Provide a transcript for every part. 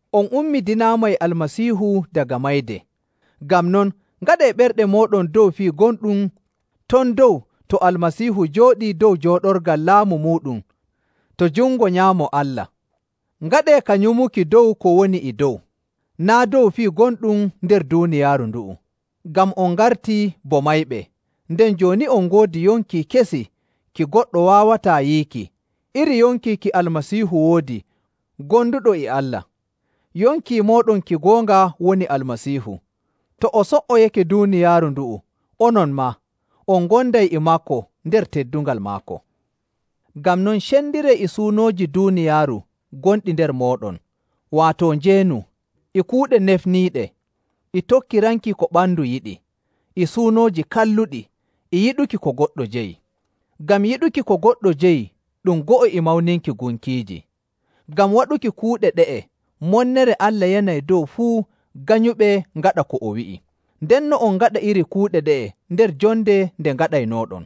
On ummidinaama e Almasiihu daga mayde. Ngam non ngaɗee ɓerɗe mooɗon dow fii gonɗum ton dow to Almasiihu jooɗii dow jooɗorgal laamu muuɗum to jungo nyaamo Allah. Ngaɗee ka nyumuki dow ko woni e dow, naa' dow fii gonɗum nder duuniyaaru ndu'u, ngam on ngartii bo mayɓe, nden jooni on ngoodi yonki kesi ki goɗɗo waawataa yiiki iri yonki ki Almasiihu woodi gonduɗo e Allah. Yonki mooɗon ki goonga woni Almasiihu. To o so''oyake duuniyaaru ndu'u, onon maa, on ngonday e maako nder teddungal maako. Ngam non, cendiree e suunooji duuniyaaru gonɗi nder mooɗon, waato njeenu, e kuuɗe nefniiɗe, e tokkiranki ko ɓandu yiɗi, e suunooji kalluɗi, e yiɗuki ko goɗɗo jeyi. (Ngam yiɗuki ko goɗɗo jeyi ɗum go'o e mawninki gunkiiji). Ngam waɗuki kuuɗe ɗe'e monnere Allah yanay dow fuu ganyuɓe ngaɗa ko o wi'i. Ndenno on ngaɗa iri kuuɗe ɗe'e nder jonde nde ngaɗaynooɗon.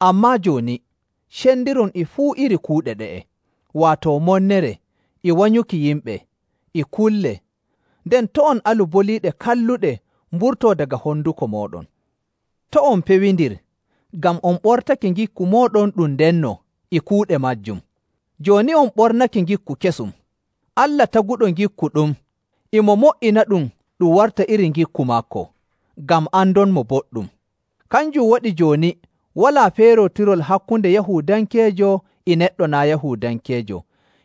Ammaa jooni, cendiron e fuu iri kuuɗe ɗe'e, waato monnere, e wanyuki yimɓe, e kulle, nden to' on alu boliiɗe kalluɗe mburtoo daga honduko mooɗon. To' on pewindir, ngam on ɓortake ngikku mooɗon ɗum ndenno e kuuɗe maajum. Jooni on ɓornake ngikku kesum. Allah taguɗo ngikku ɗum, e mo mo''inaɗum ɗum warta iri ngikku maako, ngam andonmo boɗɗum. Kanjum waɗi jooni walaa feerootirol hakkunde Yahuudankeejo e neɗɗo naa' Yahuudankeejo,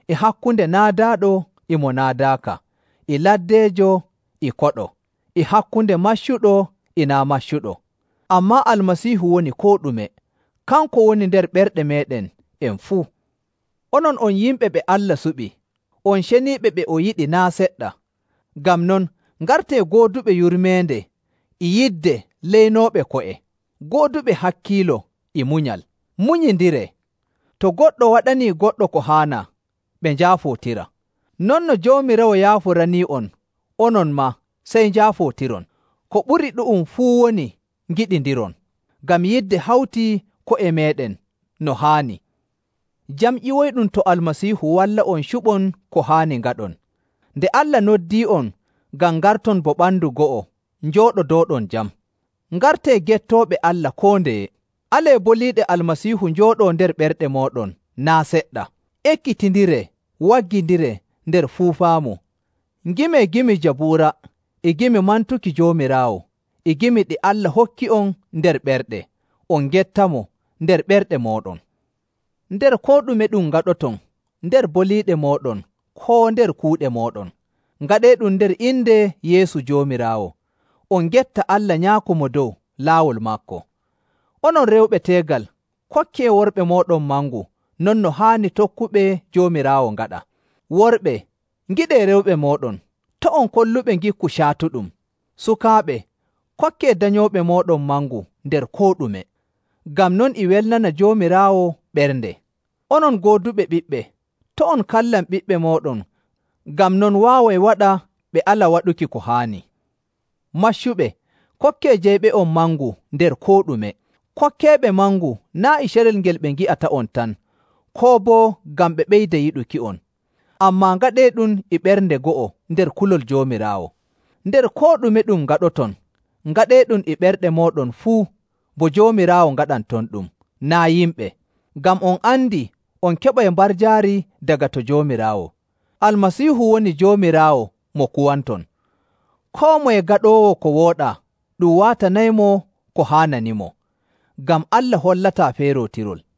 e hakkunde naadaaɗo e mo naadaaka, e laddeejo, e koɗo, e hakkunde maccuɗo e naa' maccuɗo. Ammaa Almasiihu woni koo ɗume, kanko woni nder ɓerɗe meeɗen en fuu. Onon on yimɓe ɓe Allah suɓi, on ceniiɓe ɓe o yiɗi naa' seɗɗa. Ngam non, ngartee gooduɓe yurmeende e yidde leynooɓe ko'e, gooduɓe hakkiilo e munyal. Munyindiree. To goɗɗo waɗanii goɗɗo ko haanaa, ɓe njaafootira. Non no Joomiraawo yaaforanii'on, onon maa sey njaafootiron. Ko ɓuri ɗu'um fuu woni ngiɗindiron, ngam yidde hawtii ko'e meeɗen no haani. Jam ƴiwoyɗum to Almasiihu walla'on cuɓon ko haani ngaɗon, nde Allah noddii'on ngam ngarton bo ɓandu go'o njooɗodooɗon jam. Ngartee gettooɓe Allah koo ndeye. Alee boliiɗe Almasiihu njooɗoo nder ɓerɗe mooɗon naa' seɗɗa. Ekkitindiree, waggindiree nder fuu faamu. Ngimee gimi Jabuura, e gimi mantuki Joomiraawo, e gimi ɗi Allah hokki'on nder ɓerɗe, on ngettamo nder ɓerɗe mooɗon. Nder koo ɗume ɗum ngaɗoton, nder boliiɗe mooɗon koo nder kuuɗe mooɗon, ngaɗeeɗum nder inde Yeesu Joomiraawo, on ngetta Allah Nyaako Mo Dow laawol maako. Onon rewɓe teegal, kokkee worɓe mooɗon mangu non no haani tokkuɓe Joomiraawo ngaɗa. Worɓe, ngiɗee rewɓe mooɗon, to' on kolluɓe ngikku caatuɗum. Sukaaɓe, kokkee danyooɓe mooɗon mangu nder koo ɗume, ngam non e welnana Joomiraawo ɓernde. Onon gooduɓe ɓiɓɓe, to' on kallan ɓiɓɓe mooɗon ngam non waaway waɗa ɓe ala waɗuki ko haani. Maccuɓe, kokkee jeyɓe'on mangu nder koo ɗume. Kokkeeɓe mangu naa' e carel ngel ɓe ngi'ata'on tan koo boo ngam ɓe ɓeyda yiɗuki'on, ammaa ngaɗeeɗum e ɓernde go'o nder kulol Joomiraawo. Nder koo ɗume ɗum ngaɗoton, ngaɗeeɗum e ɓerɗe mooɗon fuu bo Joomiraawo ngaɗantonɗum, naa' yimɓe. Ngam on andi on keɓay mbarjaari daga to Joomiraawo. Almasiihu woni Joomiraawo mo kuwanton. Koo moye gaɗoowo ko wooɗaa ɗum waatanaymo ko haananimo, ngam Allah hollataa feerootirol.